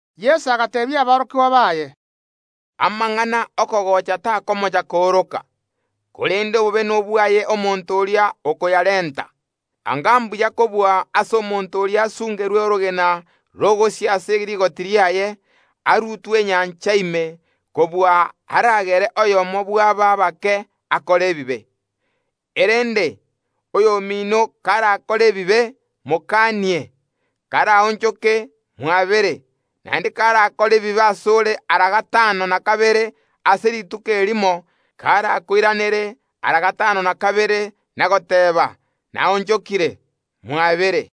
Yeso agateebia aborokigwa baye, “Amang’ana ’okogocha takomocha kooroka, korende obobe nobwaye omonto oria okoyarenta! Anga mbuya kobua ase omonto oria asungerwe orogena rogosia ase rigoti riaye, arutwe enyancha ime, kobua aragere oyomo bw’aba abake akore ebibe. Erende; oyomino karakore ebibe, mokanie; karaonchoke, mwabere. Naende karakore ebibe ase ore ara gatano na kabere ase rituko erimo, karakoiranere ara gatano na kabere na goteeba: Naonchokire, mwabere.”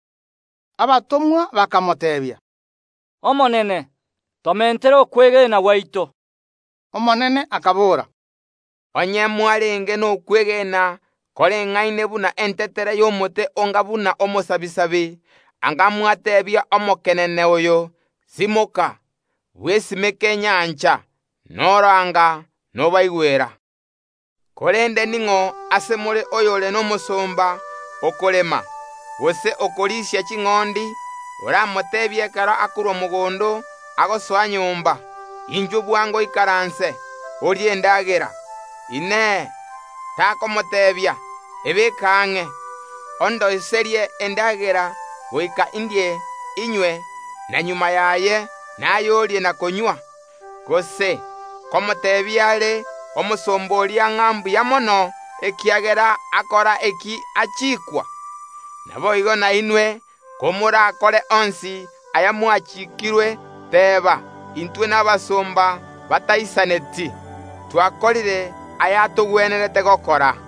Abatomwa bakamoteebia, “Omonene, tomentere okwegena gwaito.” Omonene akabora, “Onye mwarenge nokwegena koreng’aine buna entetere y’omote onga buna omosabisabi, anga mwateebia omokenene oyo: Simoka, bwesimeke nyancha, noro anga nobaigwera. “Korende ning’o ase more oyore nomosomba okorema, gose okorisia ching’ondi, oramoteebie ekero akorwa mogondo agosoa nyomba: Inchuo bwango oikaranse, orie endagera? Inee! Takomoteebia: Ebeke ang’e, ondoiserie endagera goika indie inywe, na magega yaye, naye orie na konywa? Gose nkomoteebia are omosomba oria ng’a mbuya mono, ekiagera akora eki achikwa? Naboigo nainwe, komorakore onsi aya mwachiikirwe, teba: ‘Intwe nabasomba bataisaneti; twakorire aya atogwenerete gokora.’”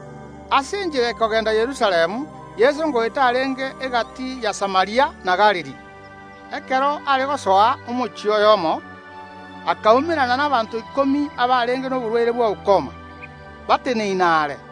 Ase enchera ekogenda Yerusalemu Yeso ngoeta arenge egati ya Samaria na Galili. Ekero are gosoa omochie oyomo, akaumerana nabaanto ikomi abarenge noborwaire bwa ukoma, bateneine are;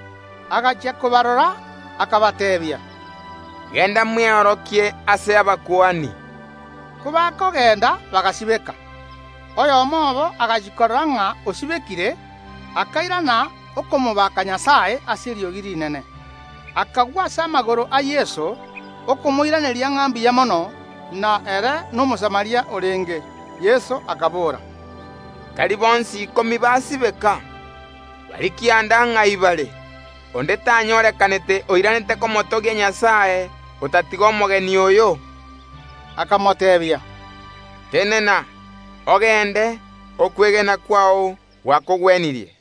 Agachia kobarora, akabateebia, “Genda mweorokie ase abakuani.” Kobakogenda bagasibeka. Oyomo obo agachia korora ng’a osibekire, akairana okomobaaka Nyasae ase eriogi rinene, akagwa ase amagoro a Yeso, okomoiraneria ng’a mbuya mono, na ere n’Omosamaria orenge. Yeso akabora, “Tari bonsi ikomi basibeka? Baria kianda, ng’ai bare? Onde tanyorekanete oiranete komotogia Nyasae, otatiga omogeni oyo?” Akamoteebia, “Tenena, ogende; okwegena kwao gwakogwenirie.”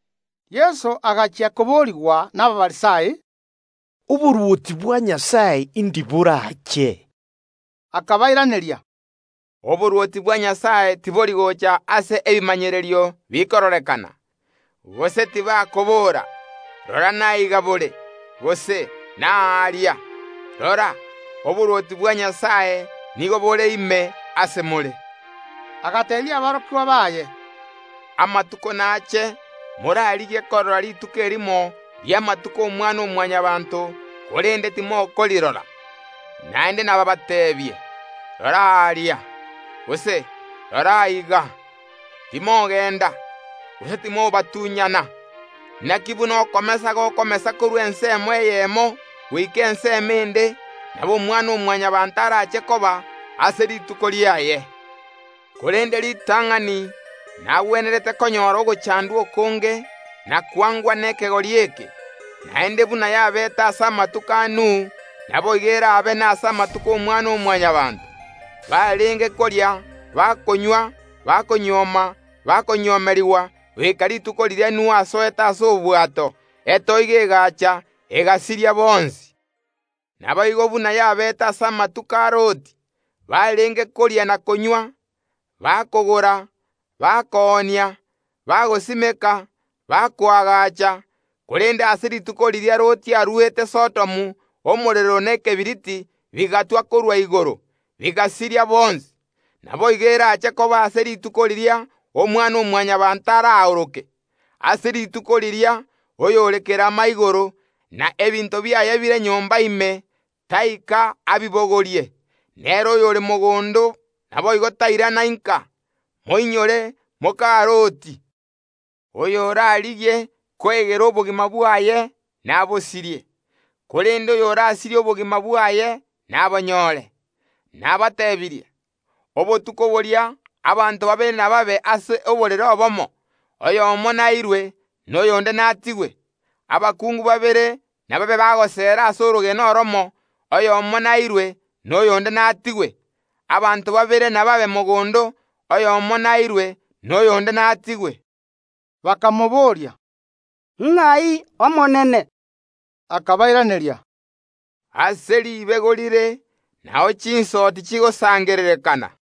Yeso agachia koborigwa n’Abafarisai, “Oborwoti bwa Nyasae indi borache?” Akabairaneria, “Oborwoti bwa Nyasae tibori gocha ase ebimanyererio bikororekana, gose tibakobora: Rora naiga bore, gose: Naaria! Rora, oborwoti bwa Nyasae nigo bore ime ase more.” Agateebia aborokigwa baye, “Amatuko nache morarigie korora rituko erimo ri’amatuko y’Omwana‐o‐Mwanyabaanto, korende timokorirora. Naende nabaabateebie: Rora aaria, gose: Rora aiga! Timogenda, gose timobatunyana. Naki buna okomesa gokomesa korwa igoro ensemo eyemo goika ensemo ende, nabo Omwana‐o‐Mwanyabaanto araache koba ase rituko riaye. Korende ritang’ani nagwenerete konyora ogochandwa okonge, na kwangwa nekegori eke. Naende buna yabeete ase amatuko a Nuhu, naboigo eraabe nase amatuko y’Omwana‐o‐Mwanyabaanto. Barenge koria, bakonywa, bakonyuoma, bakonyuomerigwa, goika rituko riria Nuhu asoete ase obwato; etoigo egaacha, egasiria bonsi. Naboigo buna yabeete ase amatuko a Loti: Barenge koria na konywa, bakogora, koonia, bagosimeka, bakoagacha. Korende ase rituko riria Loti aruete Sodomu omorero na ekebiriti bigatwa korwa igoro, bigasiria bonsi. Naboigo erache koba ase rituko riria Omwana‐o‐Mwanyabaanto araoroke. Ase rituko riria oyore kerama igoro, na ebinto biaye bire nyomba ime, taika abibogorie; nere oyore mogondo naboigo tairana inka. Moinyore moka Loti. Oyorarigie koegera obogima bwaye nabosirie, korende oyorasirie obogima bwaye nabonyoore. Nabatebirie, obotuko boria abanto babere nababe ase oborere obomo, oyomo nairwe, na oyonde natigwe. Abakungu babere nababe bagoseera ase orogena oromo; oyomo nairwe, na oyonde natigwe. [ Abanto babere inababe mogondo, oyomo nairwe, na oyonde natigwe.]” Bakamobooria, “Ng’ai Omonene?” Akabairaneria, “Ase ribego rire nao chinsoti chigosangererekana.”